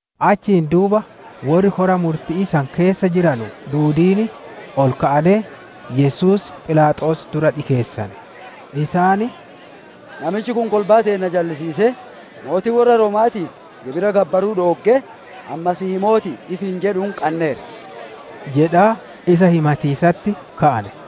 Achiin duuba worri kora murti'ii san keessa jiranu duudiin ol ka'anee, Yesuus Philaaxoos dura dhikeessane. Isaan, «Namichi kun kolbaa teenna jallisiisee, mootii worra Rooma'aatiif gibira gabbaruu dhooggee, ani Masiihii mooti'i ifiin jedhuun qanneerra» jedhaa isa himatiisatti ka'ane.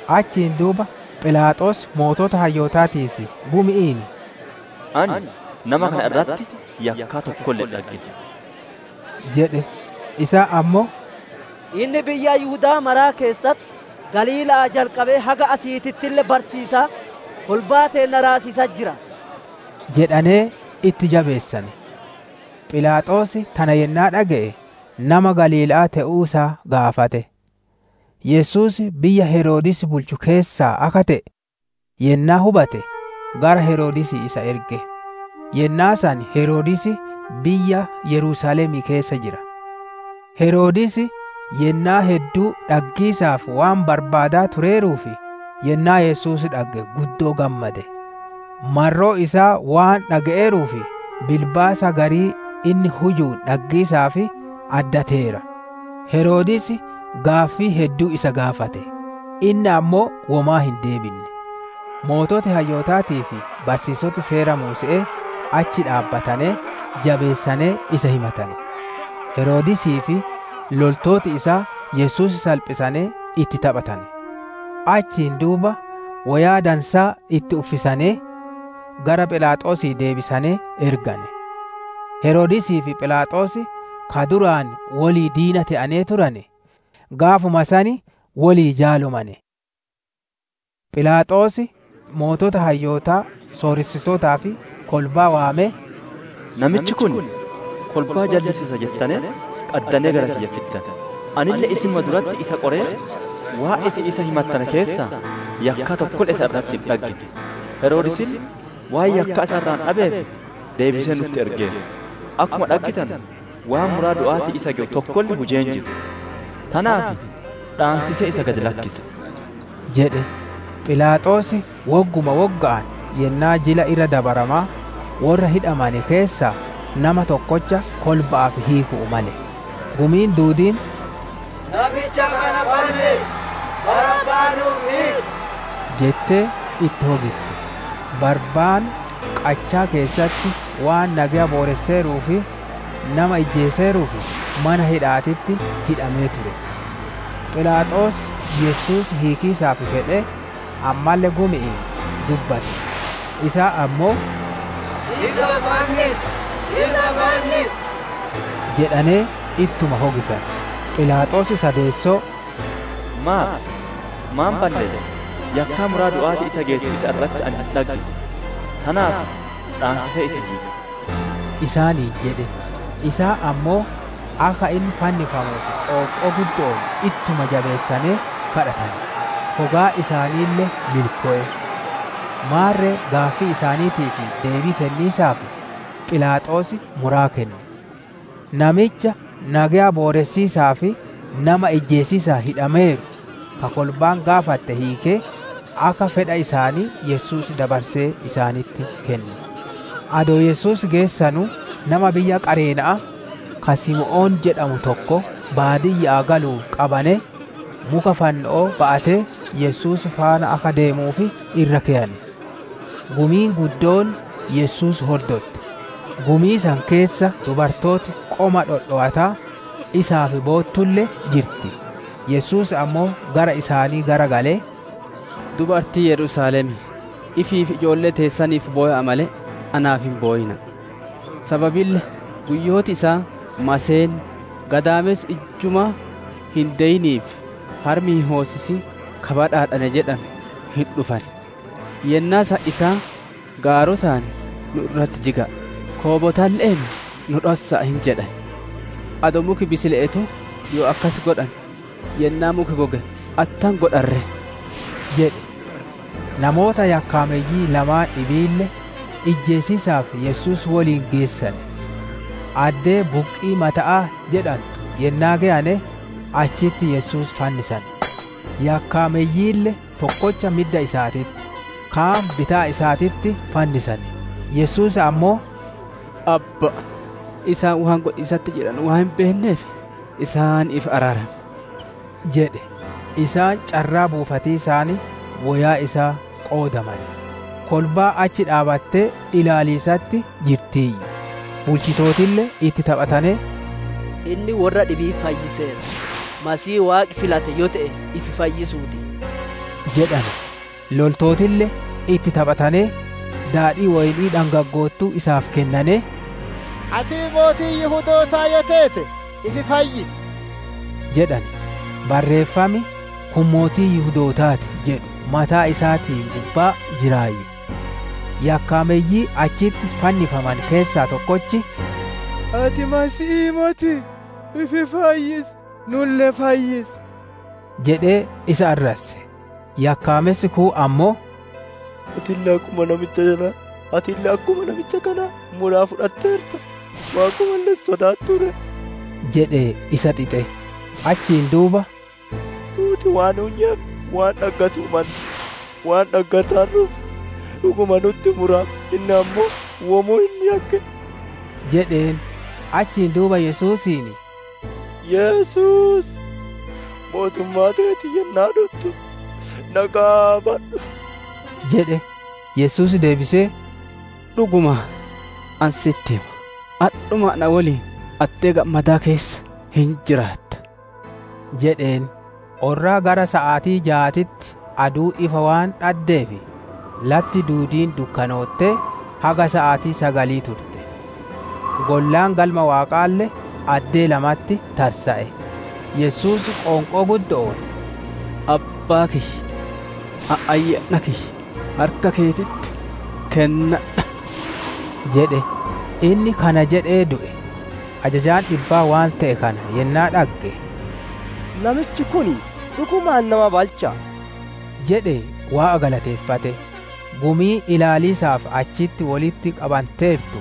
Achiin duuba Philaaxoos sooreyyii hayyootaatii fi gumi'iin, «Ani nama kana irratti yakkaa tokkolle hin dhaggine» jedhe. Isaan ammoo, «Inni biyya Yihuda'aa mara keessatti, Galiila'aa jalqabee haga asiitittille barsiisaa kolbaa teenna raasiisatti jira» jedhanee itti jabeessane. Philaaxoos tana yennaa dhage'e, nama Galiila'aa te'uu isaa gaafate. Yesuus biyya Heroodis bulchu keessaa akka te'e yennaa hubate, gara Heroodisii isa erge; yennaa san Heroodis biyya Yerusaalemii keessa jira. Heroodis yennaa hedduu dhaggiisaaf waan barbaadaa tureeruuf, yennaa Yesuus dhagge guddoo gammade. Marroo isaa waan dhage'eeruuf, bilbaasa garii inni hujuun dhaggiisaaf addateera. Heroodis gaaffii hedduu isa gaafate, inni ammoo womaa hin deebinne. Sooreyyiin hayyootaatii fi barsiisoti Seera Muuse'ee achi dhaabbatanee, jabeessanee isa himatane. Heroodisii fi loltooti isaa Yesuus salphisanee itti taphatane. Achiin duuba woyaa dansaa itti uffisanee gara Philaaxoosii deebisanee ergane. Heroodisii fi Philaaxoos ka duraan wolii diina te'anee turane, gaafuma san wolii jaalomane. Philaaxoos sooreyyii hayyootaa, sooressitootaa fi kolbaa waamee, «Namichi kun kolbaa jallisiisa jettanee, qaddanee gara kiyya fiddane; anille isinuma duratti isa qoree, waan isin isa himattane keessaa yakkaa tokkolle isa irratti hin dhaggine. Heroodisille waan yakkaa isa irraa dhabeef deebisee nutti ergeera; akkuma dhaggitanu, waan muraa du'aatiin isa gewu tokkolle hujee hin jiru. Tanaaf dhaansisee isa gad lakkisa» jedhe. [Philaaxoos wogguma wogga'aan yennaa Jila Irra Dabaramaa worra hidhamane keessaa nama tokkocha kolba'aaf hiiku'uu male.] Gumiin duudiin, «Namicha kana balleessi! Barabbaa nu'uuf hiiki!» jettee itti hogitte. Barabbaan qachaa keessatti waan nageya booresseeruu fi nama ijjeeseeruuf mana hidha'aatitti hidhamee ture. Philaaxoos Yesuus hiikiisaaf fedhee, ammalle gumi'iin dubbate. Isaan ammoo, «Isa fannisi! Isa fannisi!» jedhanee ittuma hogisane. Philaaxoos sadeessoo, «Maaf? Maan balleesse? Yakkaa muraa du'aatiin isa geettu isa irratti ani hin dhaggine. Tanaaf dhaansisee isa hiika» isaaniin jedhe. Isaan ammoo, akka inni fannifamuuf qoonqoo guddo'oon ittuma jabeessanee kadhatane; hogaan isaaniille milkowe. Maarre gaaffii isaaniitiif deebii kenniisaaf, Philaaxoos muraa kenne. Namicha nageya booressiisaa fi nama ijjeesiisaan hidhameeru, ka kolbaan gaafatte hiikee, akka fedha isaanii Yesuus dabarsee isaanitti kenne. Adoo Yesuus geessanuu, nama biyya Qareena'aa ka Simoon jedhamu tokko baadiyya'aa galuun qabanee, muka fanno'oo ba'atee Yesuus faana akka deemuuf irra keyane. Gumiin guddoon Yesuus hordotte; gumii san keessa dubartooti qoma dhowataa isaaf boottulle jirti. Yesuus ammoo gara isaanii garagalee, «Dubartii Yerusaalemii, ifii fi ijoollee teessaniif bowa'a malee, naaf hin bowina'a! Sababille guyyooti isaan, ‹Maseenni, gadaamessi ijjumaa hin deyinii fi harmi hin hoosisin ka badhaadhane› jedhanu hin dhufan. Yennaa san isaan gaarotaan, ‹Nu irratti jiga'a!› koobotalle'een, ‹Nu dhossa'a!› hin jedhan. Adoo muki bisile'eetuu yoo akkasi godhane, yennaa muki goge attam godhan ree?» jedhe. Namoota yakkaameyyii lamaan dhibiille, ijjeesiisaaf Yesuus woliin geessane. Addee «Buqqii Mata'aa» jedhantu yennaa geyane, achitti Yesuus fannisane; yakkaameyyiille tokkocha midda isaatitti, kaan bitaa isaatitti fannisane. Yesuus ammoo, «Abba'a, isaan waan godhiisatti jiranu waan hin beenneef, isaaniif araarami!» jedhe. Isaan carraa buufatiisaan woyaa isaa qoodamane. Kolbaan achi dhaabbattee ilaaliisatti jirtiiyyu; bulchitootille itti taphatanee, «Inni worra dhibii fayyiseera; Masiihii Waaqi filate yoo te'e ifi fayyisuu ti!» jedhane. Loltootille itti taphatanee, daadhii woyni'ii dhangaggoottuu isaaf kennanee, «Ati mootii Yihudootaa yoo teete, ifi fayyisi!» jedhane. Barreeffam, «Kun Mootii Yihudootaa ti» jedhu mataa isaatiin gubbaa jiraayyu. Yakkaameyyii achitti fannifamane keessaa tokkochi, «Ati Masiihii motii? Ifi fayyisi, nulle fayyisi!» jedhee isa arrasse. Yakkaamessi kuun ammoo, «Atille akkuma namicha kanaa muraa fudhatteerta, Waaqumalle hin sodaattuu ree?» jedhee isa xixe. Achiin duuba, «Nuuti waan hunyeef waan dhaggatiisaaf malle waan dhaggataarruuf, dhuguma nutti murame; inni ammoo womaa hin yakkine!» jedheen. Achiin duuba Yesuusiin, «Yesuus, mootummaa teetiin yennaa dhuttu na qaabadhu!» jedhe. Yesuus deebisee, «Dhugumaan ani sitti hima, adhuma na woliin addee gammadaa keessa hin jiraatta» jedheen. Orraa gara saatii jaatitti aduun ifa waan dhaddeef, latti duudiin dukkanoottee, haga saatii sagalii turte. Gollaan Galma Waaqaalle addee lamatti tarsa'e. Yesuus qoonqoo guddo'oon, «Abbaa kiyya, ani ayyaana kiyya harka keetitti kennadha!» jedhe. Inni kana jedhee du'e. Ajajaan dhibbaa waan te'e kana yennaa dhagge, «Namichi kun dhugumaan nama balcha'a» jedhee Waaqa galateeffate. Gumiin ilaaliisaaf achitti wolitti qabanteertu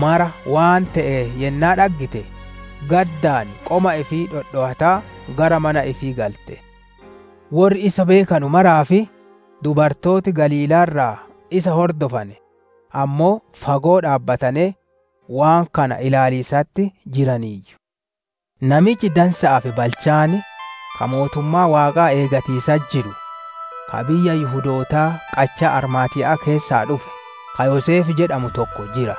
maraa waan te'e yennaa dhaggite, gaddaan qoma ifii dhodhowataa gara mana ifii galte. Worri isa beekanu maraa fi dubartooti Galiilaa irraa isa hordofane ammoo fagoo dhaabbatanee, waan kana ilaaliisatti jiraniiyyu. Namichi dansa'aa fi balchaan, ka mootummaa Waaqaa eeggatiisatti jiru, ka biyya Yihudootaa qachaa Armaatiya'aa keessaa dhufe, ka Yoseef jedhamu tokko jira.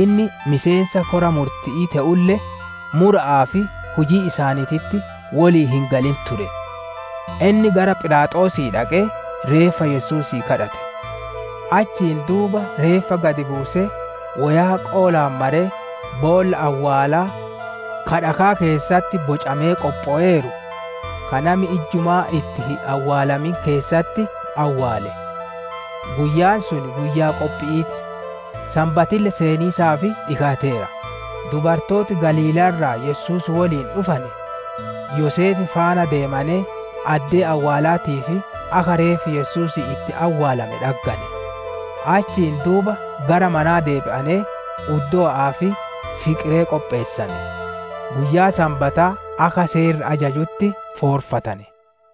Inni miseensa kora murti'ii te'ulle mura'aa fi hujii isaaniititti wolii hin galin ture. Inni gara Philaaxoosii dhaqee reeffa Yesuusii gaafate. Achiin duuba reeffa gad buusee woyaa qoolaan maree, boolla awwaalaa ka dhakaa keessatti bocamee qophoweeru, ka nami ijjumaa itti hin awwaalamin keessatti awwaale. Guyyaan sun guyyaa Qophi'ii ti, Sanbatille seeniisaaf dhikaateera. Dubartooti Galiilaa irraa Yesuus woliin dhufane, Yoseef faana deemanee addee awwaalaatii fi akka reeffi Yesuusii itti awwaalame dhaggane. Achiin duuba gara manaa deebi'anee uddowa'aa fi fiqiree qopheessane. Guyyaa Sanbataa akka Seerri ajajutti foorfatane.